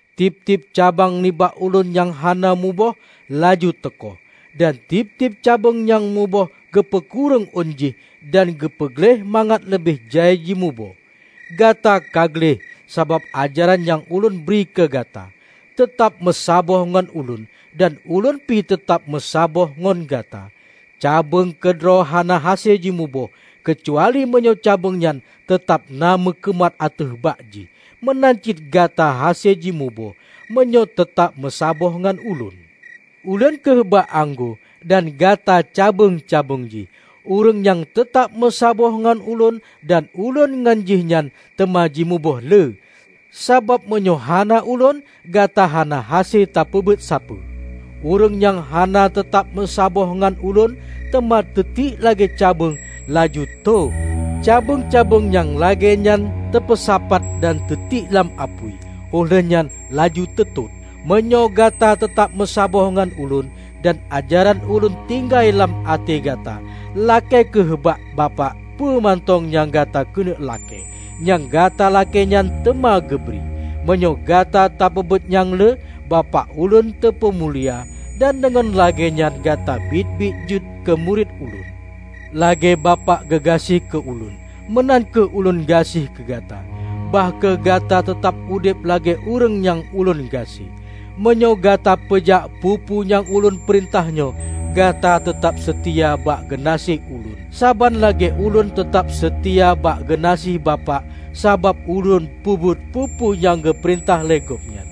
Tieb-tieb cabeueng nibak Ulôn nyang hana muboh, laju teukoh, dan tieb-tieb cabeueng nyang muboh geupeukureueng ôn jih dan geupeu gleh mangat leubeh jai jimuboh. Gata ka gleh sabab ajaran nyang Ulôn bri keugata. Teutab meusaboh ngon Ulôn dan Ulôn pi teutab meusaboh ngon gata. Cabeueng keudroe hana hase jimuboh, keucuali meunyoe cabeueng nyan teutab na meukeumat ateueh bak jih. Meunan cit gata hase jimuboh, meunyoe teutab meusaboh ngon Ulôn. Ulôn kheueh bak anggô, dan gata cabeueng-cabeueng jih. Ureuëng nyang teutab meusaboh ngon Ulôn dan Ulôn ngon jihnyan, teuma jimuboh le; sabab meunyoe hana Ulôn, gata hana hase tapeubuet sapeue. Ureuëng nyang hana teutab meusaboh ngon Ulôn, teuma teutiek lagée cabeueng, laju tho. Cabeueng-cabeueng nyang lagée nyan teupeusapat dan teutiek lam apui, óh lheuehnyan laju teutot. Meunyoe gata teutab meusaboh ngon Ulôn dan ajaran Ulôn tinggai lam até gata, lakée kheueh bak Bapak peue mantong nyang gata keuneuk lakée; nyang gata lakée nyan teuma geubri. Meunyoe gata tapeubuet nyang le, Bapak Ulôn teupeumulia; dan deungon lagée nyan gata biet-biet jeuet keu murit Ulôn. Lagée Bapak geugaséh keu Ulôn, meunan kheueh Ulôn gaséh keu gata. Bah kheueh gata teutab udeb lagée ureuëng nyang Ulôn gaséh. Meunyoe gata peujak peue-peue nyang Ulôn peurintah nyoe, gata teutab seutia bak geunaséh Ulôn, saban lagée Ulôn teutab seutia bak geunaséh Bapak sabab Ulôn peubuet peue-peue nyang geupeurintah lé Gobnyan.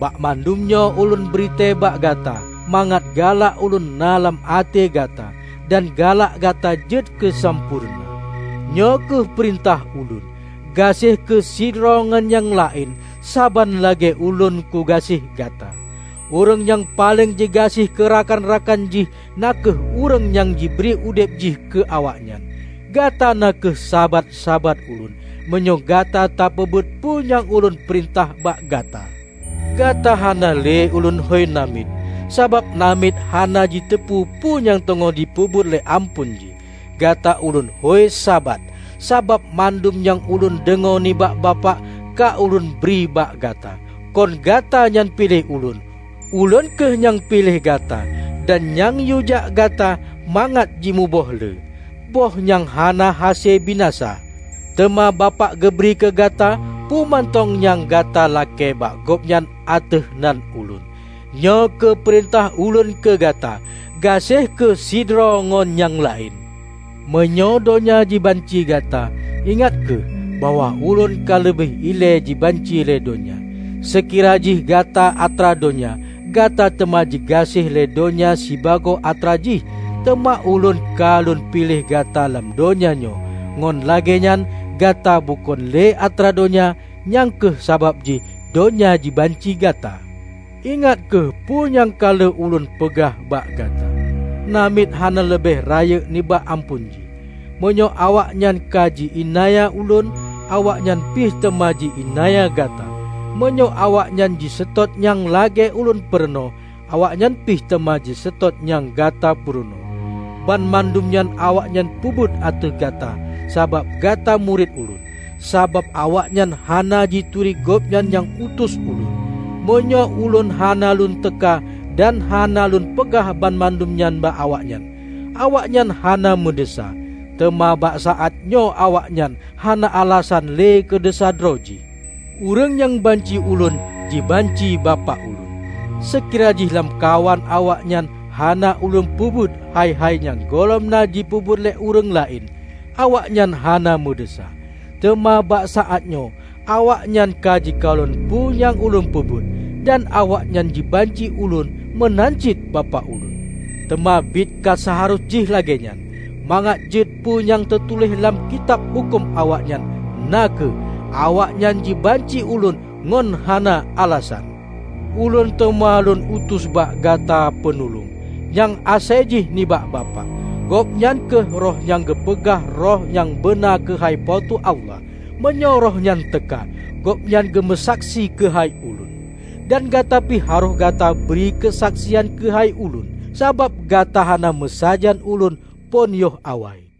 Banmandum nyoe Ulôn bri tée bak gata, mangat galak Ulôn na lam até gata, dan galak gata jeuet keusampoereuna. Nyoe kheueh peurintah Ulôn: Gaséh kheueh sidroe ngon nyang laén, saban lagée Ulôn kugaséh gata. Ureuëng nyang paleng jigaséh keu rakan-rakan jih na kheueh ureuëng nyang jibri udeb jih keu awaknyan. Gata na kheueh sabat-sabat Ulôn, meunyoe gata tapeubuet peue nyang Ulôn peurintah bak gata. Gata hana le Ulôn hôi namiet, sabab namiet hana jiteupeu peue nyang teungoh jipeubuet lé amphon jih. Gata Ulôn hôi sabat, sabab mandum nyang Ulôn deungoe nibak Bapak, ka Ulôn bri bak gata. Kon gata nyang piléh Ulôn. Ulôn kheueh nyang piléh gata, dan nyang yuejak gata mangat jimuboh le -- boh nyang hana hase binasa. Teuma Bapak geubri keu gata peue mantong nyang gatalakée bak Gobnyan ateueh nan Ulôn. Nyoe kheueh peurintah Ulôn keu gata: Gaséh kheueh sidroe ngon nyang laén." "Meunyoe donya jibanci gata, ingat kheueh bahwa ulôn ka leubeh ilée jibanci lé donya. Seukira jih gata atra donya, gata teuma jigaséh lé donya sibagoe atra jih. Teuma Ulôn ka lôn piléh gata lam donya nyoe, ngon lagée nyan gata bukon lé atra donya. Nyang kheueh sabab jih donya jibanci gata. Ingat kheueh peue nyang ka lheueh Ulôn peugah bak gata, 'Namiet hana leubeh rayeuk nibak amphon jih.' Meunyoe awaknyan ka ji-iénanya Ulôn, awaknyan pih teuma ji iénanya gata. Meunyoe awaknyan jiseutôt nyang lagée Ulôn purunoe, awaknyan pih teuma jiseutôt nyang gata purunoe. Banmandum nyan awaknyan peubuet ateueh gata, sabab gata murit Ulôn, sabab awaknyan hana jituri Gobnyan nyang utus Ulôn. Meunyoe Ulôn hana Lôn teuka dan hana Lôn peugah banmandum nyan bak awaknyan, awaknyan hana meudesya. Teuma bak saátnyoe awaknyan hana alasan le keu desya droe jih. Ureuëng nyang banci Ulôn, jibanci Bapak Ulôn. Seukira jih lamkawan awaknyan hana Ulôn peubuet hai-hai nyang gohlom na jipeubuet lé ureuëng laén, awaknyan hana meudesya. Teuma bak saát nyoe awaknyan ka jikalon peue nyang Ulôn peubuet, dan awaknyan jibanci Ulôn meunan cit Bapak Ulôn. Teuma biet ka seuharôh jih lagée nyan, mangat jeuet peu nyang teutuléh lam Kitab Huköm awaknyan, na kheueh: 'Awaknyan jibanci Ulôn ngon hana alasan.' Ulôn teuma lôn utus bak gata peunulông nyang asai jih nibak Bapak. Gobnyan kheueh Roh nyang geupeugah Roh nyang beuna keuhai Po teu Allah. Meunyoe Rohnyan teuka, Gobnyan geumeusaksi keuhai Ulôn. Dan gata pi harôh gata bri keusaksian keuhai Ulôn, sabab gata kana meusajan Ulôn phon yoh awai.